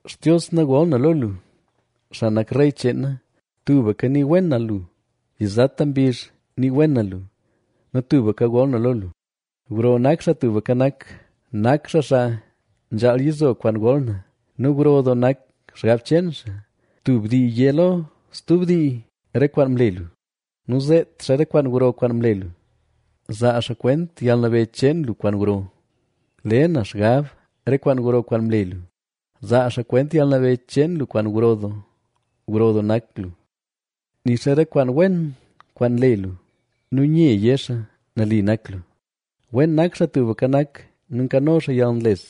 Xtios na gol na lo lu, xaa nak rey cheen na, tubka nii wen na lu. Yizata mbizh nii wen na lu nu tubka gol na lo lu. Gro nak Xaa Tubka Nak, nak xaa xaa nzhaal yizo kwaan gol na nu gro doo nak xgab cheen xaa. Tub dii yé lo stub dii re kwaan mle lu nu zeet xaa re kwaan gro kwaan mle lu. Zaa xaa kwent yalnabeyy cheen lu kwaan gro, le na xgab re kwaan gro kwaan mle lu. Zaa xaa kwent yalnabeyy cheen lu kwaan gro doo, gro doo nak lu. Nii xaa re kwaan wen kwaan nle lu nu nye yé xaa: “Nali nak lu.” Wen nak Xaa Tubka Nak nu nkano xaa yalnles,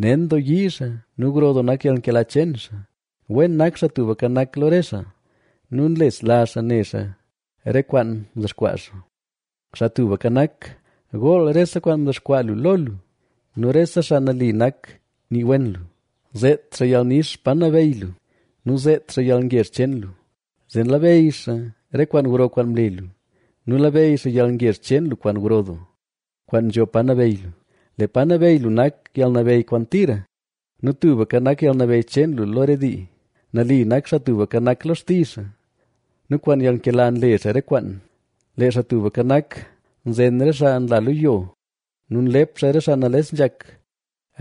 nen doo nayii xaa nu gro doo nak yalnkela cheen xaa. Wen nak Xaa Tubka Nak lo re xaa nu nlesla xaa ne xaa re kwaan mdexkwaa xaa. Xaa Tubka Nak, gool rese kwaan mdexkwaa lu lo lu nu rese xaa nali nak nii wen lu. Zeet xaa yalnix pa nabeyy lu nu zeet xaa yalngezh cheen lu, zee labeyy xaa re kwaan gro kwaan mle lu, nu labeyy xaa yalngezh cheen lu kwaan gro doo, kwaan nzho pa nabeyy lu. Lee pa nabeyy lu nak yalnabeyy kwaan tira nu tubka nak yalnabeyy cheen lu lo re dii. Nali nak Xaa Tubka Nak lo xtizh xaa nu kwaan yalnkela nle xaa re kwaan. Lee Xaa Tubka Nak, nzen re xaa nla lo yo nu nlep xaa re xaa nales nzhak.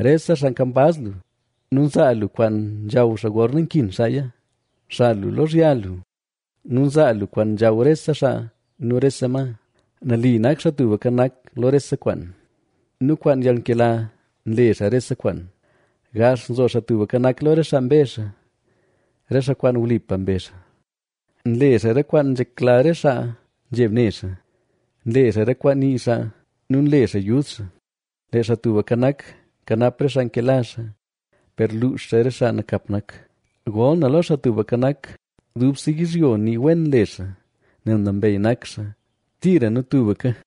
Rese xaa kambaz lu nu nzaa lu kwaan nzhaw xaa gorna nkin xaaya. Nxal lu lozhya lu nu nzaa lu kwaan nzhaw rese xaa nu rese ma. Nali nak Xaa Tubka Nak lo rese kwaan nu kwaan yalnkela nle xaa rese kwaan. Gax nzo Xaa Tubka Nak lo re xaa mbezh xaa, re xaa kwaan wlipa mbezh xaa. Nle xaa re kwaan nzhekla re xaa nzheb ne xaa; nle xaa re kwaan nii xaa nu nle xaa yud xaa. Lee Xaa Tubka Nak, nkanap re xaa nkela xaa, per luux xaa re xaa nakap nak. Gol na lo Xaa Tubka Nak, dubse yizhyo nii wen le xaa, nel nambey nak xaa, tira nu tubka.